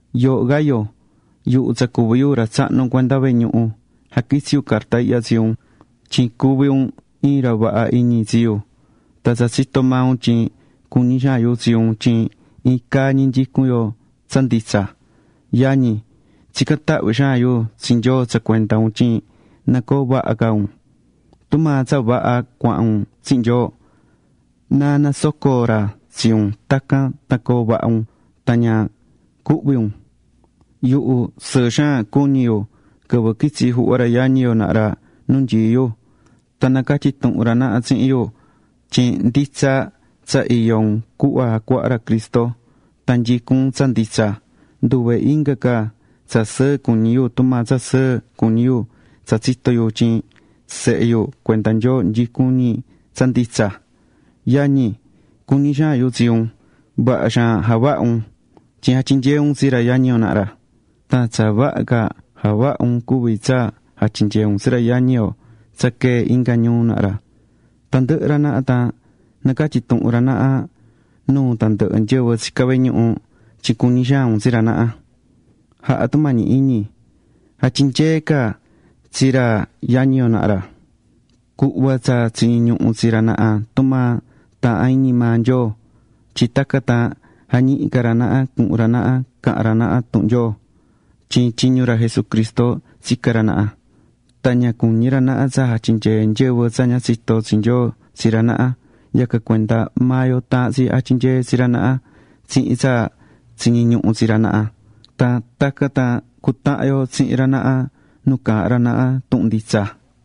Yooho Gayo, yuhu tsa cuví yu ra tsahnu cuenda vehe ñuhu, jaquitsí yu carta ihya tsi un, tyin cuví un iin ra vaha iñi tsi yu tan tsa tsitó maa un tyin cuñí xaan yu tsi un tyin iin caa ñi nyicún yo tsa nditsa. Yañi, tsicán tahvi xaan yu tsi Nyoo tsa cuenda un tyin na coo vaha ca un. Tumaa tsa vaha cuahán un tsihin Nyoo, na nasoco ra tsi un tacan tan coo vaha un tan ña cuhvi un. Yuhu sɨɨ xaan cuñi̱ yu quɨvɨ quitsi̱ juhva ra yañi yo naha ra nu nyií yu. Tan nacatyi̱ tuhun ra naha tsihin yu tyin nditsa tsa iyó un cuhva jacuaha̱ ra Cristo, tan nyicún un tsa nditsa. Nduve inga ca tsa sɨɨ cuñí yu tumaa tsa sɨɨ cuñí yu tsa tsitó yu tyin sehe yu cuenda Nyoo nyicún ñi tsa nditsa. Yañi, cuñí xaan yu tsi un. Vaha xaan javahá un, tyin jatyinyeé un tsi ra yañi yo naha ra. Tsa vaha ca javahá un cuví tsa jatyinyeé un tsi ra yañi yo tsa quee̱ inga ñuu. naha ra. Tandɨhɨ ra naha, tan nacatyí tuhun ra naha nuu tandɨhɨ nyɨvɨ tsicá vehe ñuhu tyin cuñí xaan un tsi ra naha. Ja̱ha tumañi iñi, ja̱tyinyee ca tsi ra yañi yo naha ra, cu̱hva tsa tsiñí ñuhu tsi ra naha tumaa taahán iñi maa Nyoo. Tyin tacan tan jañihi ca ra naha cuhun ra naha cahan ra naha tuhun Nyoo. Tyin tyiñu ra Jesucristo tsicá ra naha. Tan ña cuñí ra naha tsa jatyinyee nyɨvɨ tsa ña tsitó tsi Nyoo tsi ra naha. Yacan cuenda maa yo taahán tsi jatyinyee tsi ra naha tsihin tsa tsiñí ñuhu tsi ra naha. Tan tacan tan cutahan yo tsihin ra naha nu caahán ra naha tuhun nditsa.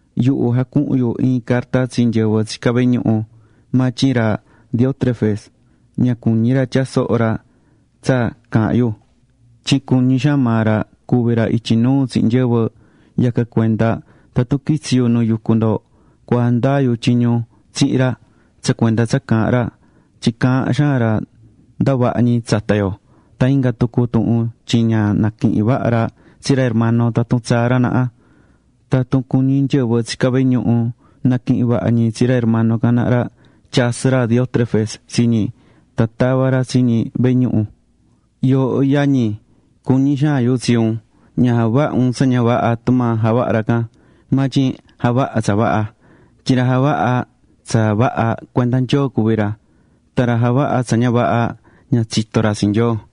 Yuhu jacuhu̱n yu iin carta tsi nyɨvɨ tsicá vehe ñuhu, maa tyin ra Diótrefes ña cuñí ra tyaa soho ra tsa caahán yu tyin cuñí xaan maa ra cuvi ra ityi nuu tsihin nyɨvɨ. Yacan cuenda tatun quitsi yu nu yucú ndo cua jandaa yu tyiñu tsihin ra tsa cuenda tsa caahán ra, tyin caahán xaan ra ndavaha ñi tsata yo. Tan inga tucu tuhun tyin ña naquihín vaha ra tsi ra hermano tatun tsaá ra naha. Tan tatun cuñí nyɨvɨ tsicá vehe ñuhu naquihín vaha ñi tsi ra hermano can naha ra, tyasɨ́ ra Diótrefes tsi ñi, tan tavá ra tsi ñi vehe ñuhu. Yooho yañi yu tsa cuñí xaan yu ña ja̱vaha un tsa ña vaha tumaa javahá ra can, maa tyin ja̱vaha tsa vaha. Tyin ra javahá tsa vaha, cuenda Nyoo cuví ra, tan ra javahá tsa ña vaha, ña tsitó ra tsi Nyoo.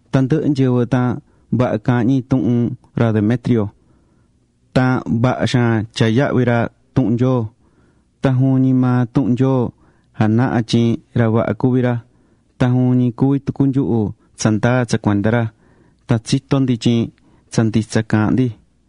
Tandɨhɨ nyɨvɨ tan vaha caahán ñi tuhun ra Demetrio. Tan vaha xaan tyaá yahvi ra tuhun Nyoo, tan juvin ñi maa tuhun Nyoo janahá tyin ra vaha cuví ra. Tan juvin ñi cuví tucu nyuhu tsandaa tsa cuenda ra, tan tsitó ndo tyin tsa nditsa caahán ndi.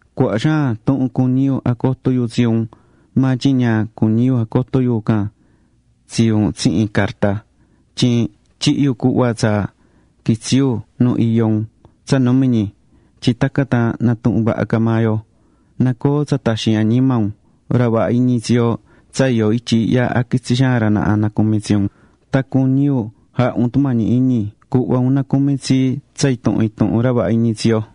Cuaha xaan tuhun cuñí yu jacoto yu tsi un, maa tyin ña cuñí yu jacoto yu can tsi un tsihin carta. Tyin tyihí yu cuhva tsa quitsi yu nu iyó un tsa numi ñi, tyin tacan tan natuhun vaha ca maa yo. Na coo tsa taxin añima un. Ra vaha iñi tsi yo tsa iyó ityi ihya jaquitsí xaan ra naha nacumi tsi un. Tan cuñí yu ja̱ha un tumañi iñi cu̱hva un nacumi tsi tsa intuhun intuhun ra vaha iñi tsi yo.